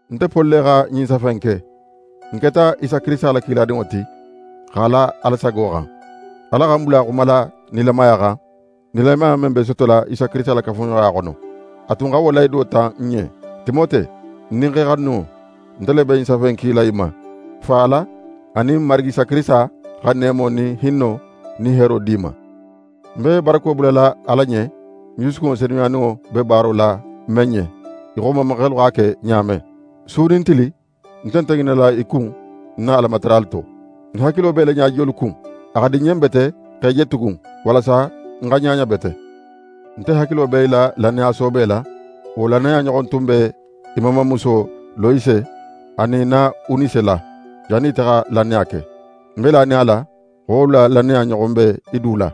Nte Poli le xa ɲin safe in ke. Ń keta Isa Kirisita la kiladinŋo ti, x'a la Ala sago xan. Ala xa ń bula xumala nilamaya xan, nilamaya men be sotola Isa Kirisita la kafuɲoxoya xono. A tun xa wo lahido ta n ɲen. Timote, ń dinxe xanuninŋo, nte le be ɲin safe in kila í ma. Fa Ala anin n Marigi Isa Kirisita xa neemo nin hinno nin heero di í ma. Ń be barako bulala Ala ɲen, ń jusukunŋo senuyaninŋo be baaro la men ɲen, í xo n mamaxelu x'a ke ɲa men. Su nin tili, ń nte ŋinala í kun ń na Alamataralu to. Ń hakilo be í la ɲajiyolu kun. A xa di ń ɲen bete x'é je tugun, walasa ń xa ɲaɲa bete. Nte hakilo be í la lannaya soobe la. Wo lannaya ɲoxon tun b'é mamamuso Loyise anin í na Unise la, jannin ite xa lannaya ke. Ń be lanin a la xo wolu la lannaya ɲoxon be í du la.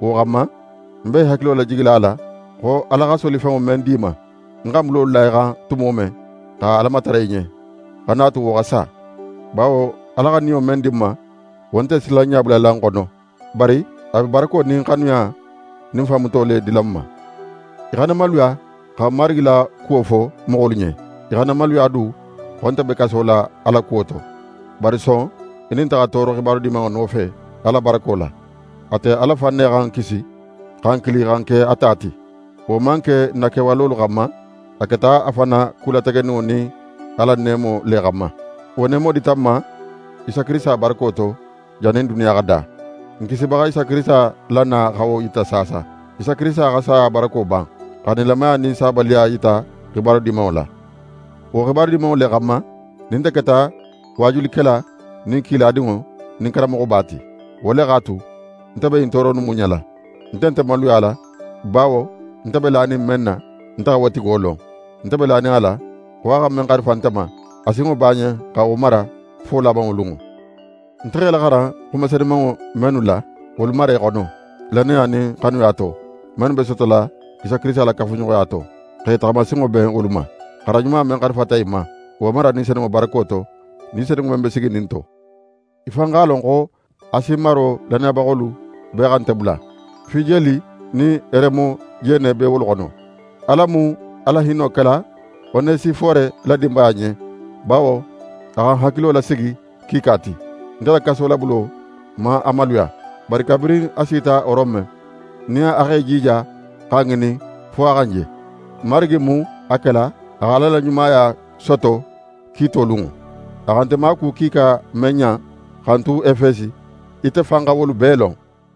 Wo xanma, ń be í hakilo lajigila a la xo Ala x'a la solifenŋo men di í ma, ń xa ń bulolu la í xan tumo men, xa Ala matara í ɲen, xana a tu wo xa sa. Bawo Ala xa Niyo men di n ma, wo nte silanɲa bulala n xono, bari a be barako nin xanuya nin fanmuto le dila n ma. Í xana maluya xa n Marigi la kuwo fo moxolu ɲen. Í xana maluya du xo nte be kaso la a la kuwo to. Bari son í nin nte xa tooro xibaru Dimanŋo nofe, Ala barako la. Ate Ala fan ne xa n kisi, xa n kili xa n ke a ta ti. Wo man ke n na kewalolu xanma; a keta a fan na ku lategeninŋo nin a la neemo le xanma. Wo neemo dita n ma Isa Kirisita barako to, jannin duniya xa da. N Kisibaxa Isa Kirisita la na xa wo yita saasa. Isa Kirisita xa saya barako ban, xa nilamaya nin sabaliya yita Xibaru Dimanŋo la. Wo Xibaru Dimanŋo le xanma, nin nte keta waajulikela nin kiladinŋo nin karanmoxoba ti. Wo le x'a tu, nte be ɲin tooro innu muɲala. Nte nte maluyala; bawo nte be lanin men na, nte xa wo tigo lon. Nte be lanin a la, xo a xa men xarifa nte ma, a sinŋo b'a ɲen xa wo mara fo labanŋo lunŋo. Nte x'é laxaran xuma senumanŋo mennu la, wolu mara í xono, lannaya nin xanuya to, mennu be sotola Isa Kirisita la kafuɲoxoya to, x'é taxamasinŋo ben wolu ma. Xaran ɲuma men xarifata í ma, wo mara Ni Senunŋo barako to, Ni Senunŋo men be siginin n to. Í fan x'a lon xo Asi maro lannayabaxolu bee xa nte bula. Fijeli nin Heremojene be wolu xono. Ala mu a la hinno kela Onesifore la dinbaya ɲen, bawo a xa ń hakilo lasigi kiika ti. Nte la kasolabulo man a maluya, bari kabirin a sita Rome, nin a x'é jija xa ń ŋinin, fo a xa ń je. Marigi mu a kela a xa Ala la ɲumaya soto kiito lunŋo. A xa nte maaku kiika men ɲan xa ń tu Efesi, ite fan xa wolu bee lon.